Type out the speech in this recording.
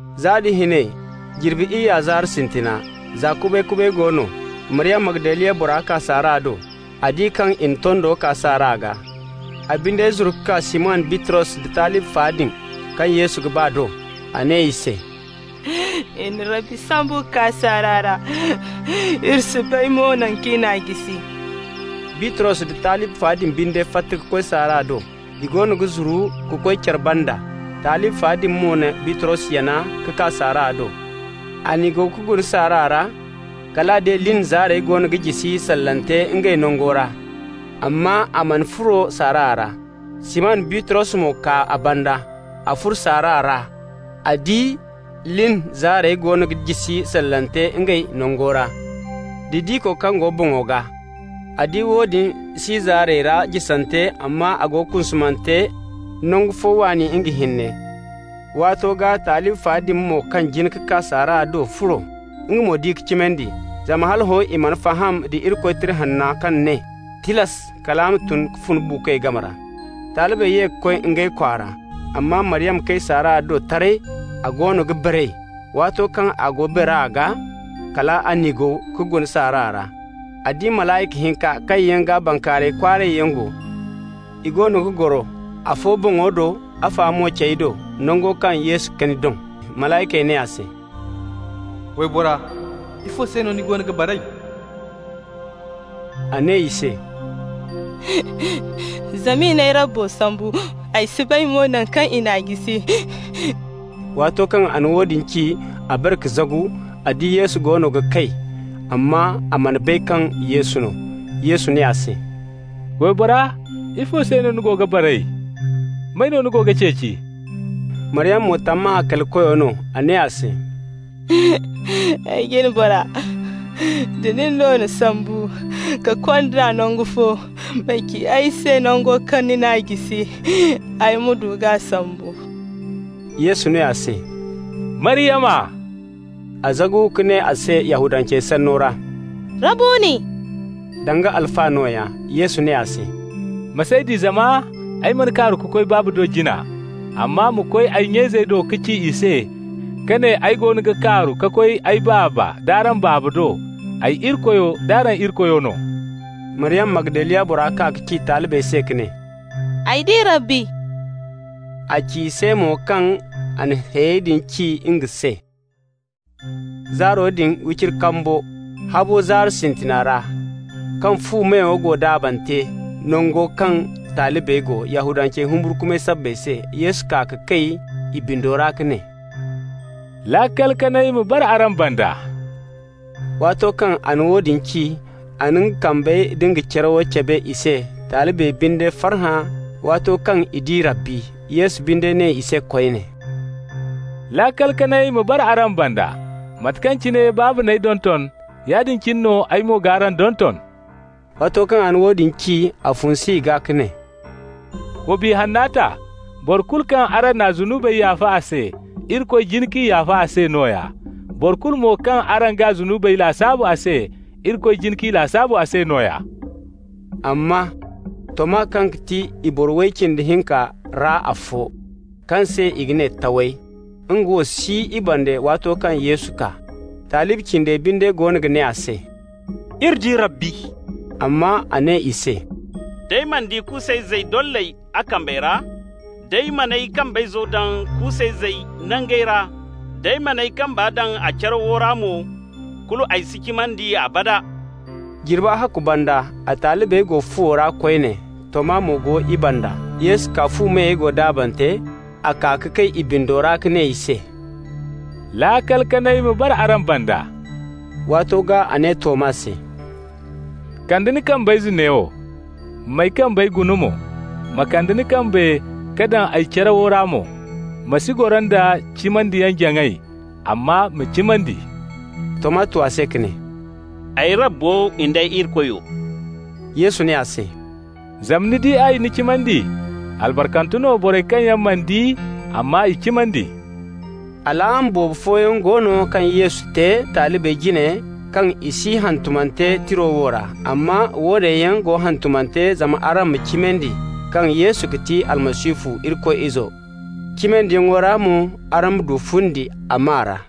Za da hinay jirbi iyya zaari sintina, za kubay-kubay go no, Maryama, Magdaliya bora kaa saara do. A di kaŋ i na tondo kaa saara gaa. A binde zuru ka kaa Siman Bitros da talibi fa din kaŋ Yesu ga ba do. A ne i se: «I na Rabbi sambu ka kaa saara ra. Iri si bay mo naŋ kaŋ i n'a jisi.» Bitros da talibi fa din binde fatta ka koy saara do. I goono ga zuru ka koy care banda. Talibi fa din mo na Bitros yana ka kaa saara do. A niigaw ka guna saara ra. Kal a di lin zaarey goono ga jisi sallante ngey nango ra, amma a mana furo saara ra. Siman Bitros mo kaa a banda. A furo saara ra. A di lin zaarey goono ga jisi sallante ngey nango ra, da diko kaŋ go boŋo gaa. A di woodin si zaarey ra jisante, amma a go kunkunante nangu fo waani nga hinne. Waato gaa talibi fa din mo kaŋ jin ka kaa saara do furo. Nga mo di ka cimandi. Zama hala hõ i mana faham da Irikoy Tira Hanna kaŋ ne tilas a ga tun ka fun buukoy game ra. Talibey ye ka koy ngey kwaara. Amma Maryama kay saara do taray, a goono ga baray. Waato kaŋ a go bara gaa, kal a niigaw ka guna saara ra. A di malayka hinka kaŋ yaŋ gaa bankaaray kwaaray yaŋ go. I goono ga goro, afo boŋo do, afa mo cey do, nango kaŋ Yesu kani doŋ. Malaykey ne a se: «Waybora, ifo se no ni goono ga baray?» A ne i se: «Zama i n'ay Rabbo sambu, ay si bay mo naŋ kaŋ i n'a jisi.» Waato kaŋ a na woodin ci, a bare ka zagu. A di Yesu goono ga kay, amma a mana bay kaŋ Yesu no. Yesu ne a se: «Waybora, ifo se no ni goono ga baray? May no ni go ga ceeci?» Maryama mo tammahã kali koyo no. A ne a se: «Ay jine bora, da nin no n'a sambu ka kond'a nangu fo, ma ci ay se nango kaŋ ni n'a jisi, ay mo g'a sambu.» Yesu ne a se: «Maryama!» A zagu ka ne a se Yahudancey sanno ra: «Rabbuni!» (Danga Alfa nooya.) Yesu ne a se: «Ma s'ay di zama ay mana kaaru ka koy Baaba do jina. Amma ma koy ay nya-izey do ka ci i se ka ne ay goono ga kaaru ka koy ay Baaba nd'araŋ Baaba do, ay Irikoyo nd'araŋ Irikoyo no.» Maryama, Magdaliya bora, kaa ka ci talibey se ka ne: «Ay di Rabbi!» A ci i se mo kaŋ a na hayey din ci nga se. Zaaro din wiciri kambo, habo zaari sintina ra, kaŋ fu meyey go daabante nango kaŋ talibey go Yahudancey humburkumay sabbay se, Yesu kaa ka kay i bindo ra ka ne: «Laakal kanay ma bara araŋ banda.» Waato kaŋ a na woodin ci, a na nga kambey da nga carawo cabe i se. Talibey binde farhã waato kaŋ i di Rabbi. Yesu binde ne i se koyne: «Laakal kanay ma bara araŋ banda. Mate kaŋ cine Baaba n'ay donton, yaadin cine no ay mo g'araŋ donton.» Waato kaŋ a na woodin ci, a funsu i gaa ka ne: «Wa Biya Hanna ta. Boro kulu kaŋ araŋ n'a zunubey yaafa a se, Irikoy jin k'i yaafa a se nooya. Boro kulu mo kaŋ araŋ g'a zunubey lasaabu a se, Irikoy jin k'i lasaabu a se nooya.» Amma Toma, kaŋ ga ti i boro way cindi hinka ra afo, kaŋ se i ga ne Taway, nga wo si i banda waato kaŋ Yesu kaa. Talibi cindey binde goono ga ne a se: «Iri di Rabbi!» Amma a ne i se: «D'ay mana di kuusayzey dolley a kambey ra, d'ay man'ay kambayzo daŋ kuusayzey nangey ra, d'ay man'ay kamba daŋ a carawo ra mo, kulu ay si cimandi abada.» Jirbi ahakku banda a talibey go fuwo ra koyne, Toma mo go i banda. Yesu kaa, fu meyey go daabante. A kaa ka kay i bindo ra ka ne i se: «Laakal kanay ma bara araŋ banda.» Waato gaa a ne Toma se: «Kande ni kambayze neewo, m'ay kambey guna mo. Ma kande ni kambe ka daŋ ay carawo ra mo. Ma si goro nda cimandiyaŋ-jaŋay, amma ma cimandi.» Toma tu a se ka ne: «Ay Rabbo nd'ay Irikoyo!» Yesu ne a se: «Zama ni di ay, ni cimandi. Albarkante no borey kaŋ yaŋ mana di, amma i cimandi.» Alaama boobo fooyaŋ go no kaŋ Yesu te talibey jine kaŋ si hantumante tira wo ra. Amma woone yaŋ go hantumante zama araŋ ma cimandi kaŋ Yesu ga ti Almasihu, Irikoy Izo, cimandiyaŋ ra mo araŋ ma du fundi a maa ra.